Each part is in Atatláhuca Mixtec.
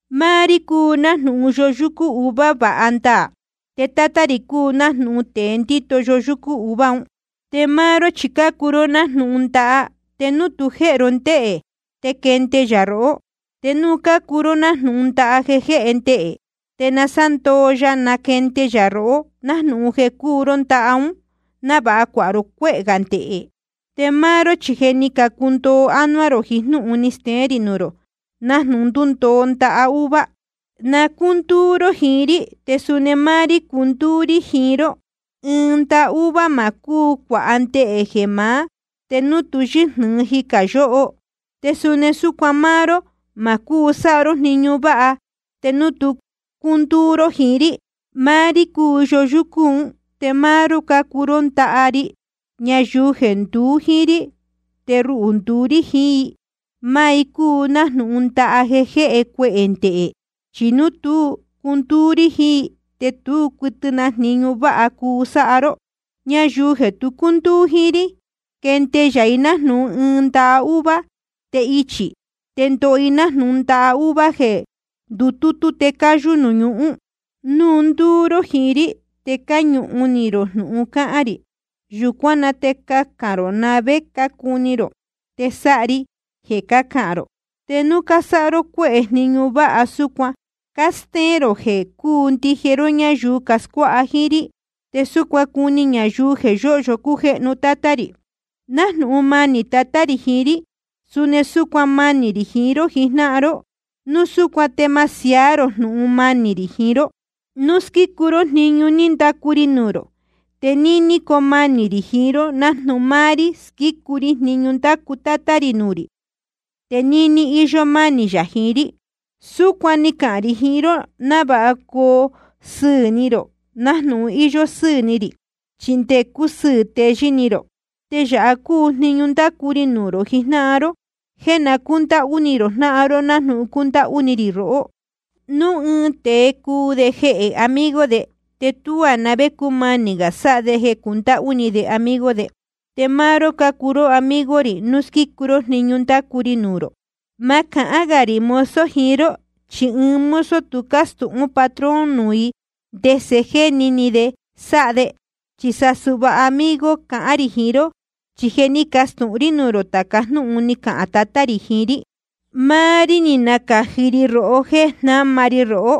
’Máá rí cúu nájnūhun yoyúcú uva váha ndaā, te Tátá rī cúu nájnūhun tēe ndíto yoyúcú uva un. Te máá ró chi cácuu ró nájnūhun ndaha, te núu tu jéhe ró ndéhē te quende yā rohó. Te núu cácuu ró nájnūhun ndaha jeē jéhe ndehē, te nasándoo ya nacahnde yā rohó nájnūhun jeē cúu ró ndaha ún, návāha cuāha ró cuéhē gā ndehē. Te máá ró chi je ni candundoo ánuá rō jiín jnúhun ni steén rī nuū rō, nájnūhun ndúndoo ndaha uva. Na cúndúú ró jiín rí, te suni máá rí cundúú rí jiín ró. Ɨɨn ndaha uva ma cúu cuāha ndehē jeē maá, te núu tu yɨ́jnɨ̄ɨ jicā yóho. Te suni súcuan máá ró, ma cúu sáha ró jniñu váha te núu tu cúndúú ró jiín rí. ’Máá rí cúu yoyúcú un, te máá ró cácuu ndaha ri. Ñayuu jeē nduú jíín rí, te ruhū ndúú rí jiín i, máá i cúu nájnūhun ndaha jeē jéhe cuehē ndehē. Chi núu tú cundúú ró jiín rí, te tú cuɨtɨ na jniñu váha cuu sáha ró. Ñayuu jeē tu cúndúú jíín rí, quende yā i nájnūhun ɨɨn ndaha uva, te ichī. Te ndoho i nájnūhun ndaha uva un jéē ndutútú te cayū nuū ñuhún. ’Núu ndúú ró jiín rí, te cáñuhun ni rō jnūhun cáhán rī, yūcuán na te cacān rō na‑ni vé cácuni rō, te sáha ri jeē cácahān rō. Te núu cásáha ró cuéhē jniñu váha, súcuan cástéén rō jeē cúu ndije ró ñáyuu cascuáha jíín rí, te súcuan nácuni ñayuu jeē yóhyo cújéhnu Tátá rī. Nájnūhun manī Tatá rī jiín rí, suni súcuan manī rī jiín ró jijnáhan ró. Núu súcuan te ma siaá rō jnūhun manī rī jiín ró. Núu squícu ró jniñu ní ndacu ri nuū rō, te níní coo manī rī jiín ró, nájnūhun máá rí squícu ri jniñu ní ndacu Tátá rī nuū rī, te níní íyó mánī yā jiín rí. ’Súcuan ni cahān rī jiín ró návāha coo sɨɨ̄ ni rō nájnūhun íyó sɨ́ɨ̄ ni rī, chi nde cusɨɨ̄ teyɨ́ ni rō. Te yāha cúu jniñu ndácu ri nuū rō jijnáhan ró: jeē na cúndáhú ni rō jnáhan ró nájnūhun cúndáhú ni rī rohó. Núu ɨɨn tēe cuu de jehē amigo de, te tuá na vé cúmanī gā sáha de jeē cundáhú ni de amigo de. Te máá ró cácuu amigo rī núu squícu ró jniñu ndácu ri nuū rō. Ma cahán gā rī mozo jiín ró, chi ɨɨn mozo tu cástūhún patrón nuū i ndese jéni ni de sáha de. Chi sa suhva amigo cahān rī jiín ró, chi je ni castūhun rí nuū rō tāca jnúhun ni cahān Tatá rī jiín rí. Máá rí ni nacāji róhó jéē jnáma ri rohó,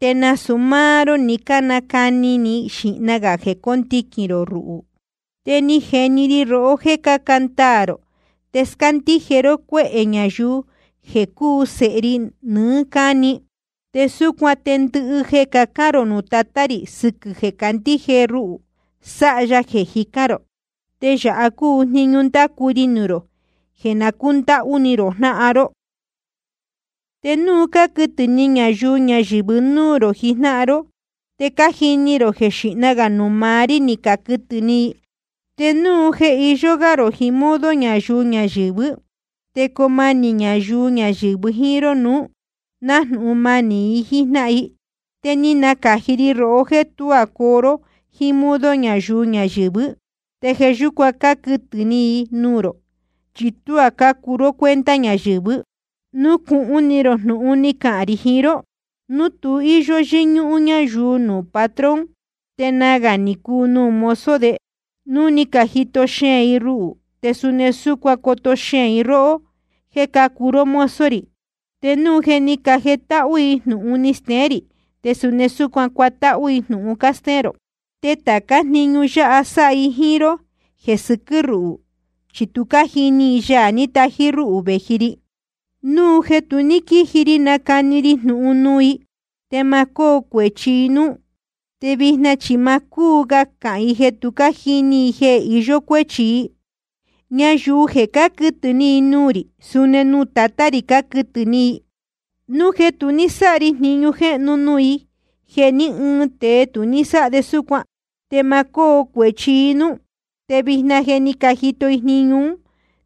te nasūu máá ró ni cánacani ni xīhna gā jeē cóndiquīn rō ruhū. Te ni jeni ri rohó jéē caca ndaā rō te scándíje ró cuéhē ñayuu jeē cuu i sēhe ri nɨɨ́ cáni. Te súcuan te ndɨhɨ jeē cacán rō nuū Tatá rī sɨquɨ̄ jeē cácandíje ró rúhū, sáha ya jeē jicán rō. Te yāha cúu jniñu ndácu ri nuū rō: jeē na cúndáhú ni rō jnáhan ró. ’Te núu cáquɨtɨ̄ ni ñayuu ñayɨ̄vɨ núū rō jijnáhan ró, te je cájini rō jeē xíhna gā nuū maá rí ni caquɨtɨ̄ ni i. Te núu jeē iyó gá rō jiín modo ñayuu ñayɨ̄vɨ́, te coo manī ñayuu ñayɨ̄vɨ jíín ró nuú, nájnūhun manī i jíín jnáhan i. Te ni nacāji ri rohó jéē tuá coo ró jíín modo ñayuu ñayɨ̄vɨ́. Te jeē yúcuan cáquɨtɨ̄ ni i nuū rō, chi tuá cácuu ró cuenta ñayɨ̄vɨ́. Nucūhun ni rō jnūhun ni cahān rī jiín ró: Núu tu íyó yɨ́ñúhún ñáyuu nuū patrón, te nagā ni cuu nuū mozo de. Núu ni cajito xeēn i ruhū, te suni súcuan coto xeēn i róhó jéē cácuu ró mozo rī. Te núu jeē ni cájetáhú i jnūhun ni steén rī, te suni cuatáhú i jnūhun cástéén rō. Te tācá jniñu yáha sáha i jíín ró jeē sɨquɨ́ ruhū, chi tu cájini i Yaā ní tají rúhū vēji ri. ’Núu jeē tu ní quíji ri nacani ri jnūhun nuū i, te ma cóo cuēchi i núú. Te vijna chi ma cúu ga cahān i jeē tu jíní i jeē iyó cuéchi i. Ñayuu jeē cáquɨtɨ̄ ni nuū rī, suni nuū Tatá rī cáquɨtɨ̄ ni i. Núu jeē tu ní sáha ri jniñu jéhnu nuū i jeē ní ɨɨn tēe tu ní sáha de súcuan, te ma cóo cuēchi i núú. Te vijna je ni cajito i jniñu ún,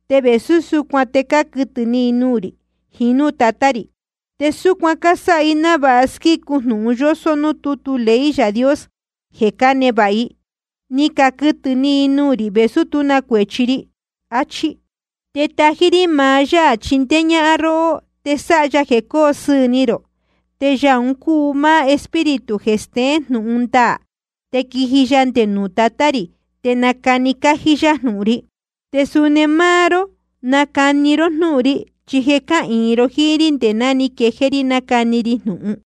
te vēsú súcuan te cáquɨtɨ̄ ni i nuū rī jiín núū Tatá rī. Te súcuan cásáha i návāha squícu jnūhun yósó núū tútu ley Yaā Dios jeē cánevāha i: Ni caquɨtɨ̄ ni i nuū rī, vēsú tú na cuēchi ri, achí. ’Te tají rí maá Yaā chindéé ñáhán róhó te sáha ya jeē cóo sɨɨ̄ ni rō. Te Yaā un cúu máá Espíritu jeē steén jnūhun ndaā, te quiji ya nde nuū Tatá rī, te nacani cájí yá jnūhun ri. Te suni máá ró nacani ró jnúhun ri, chi je cáhīin ro jíín rí nde ná ni quejéé rí nácani ri jnūhun.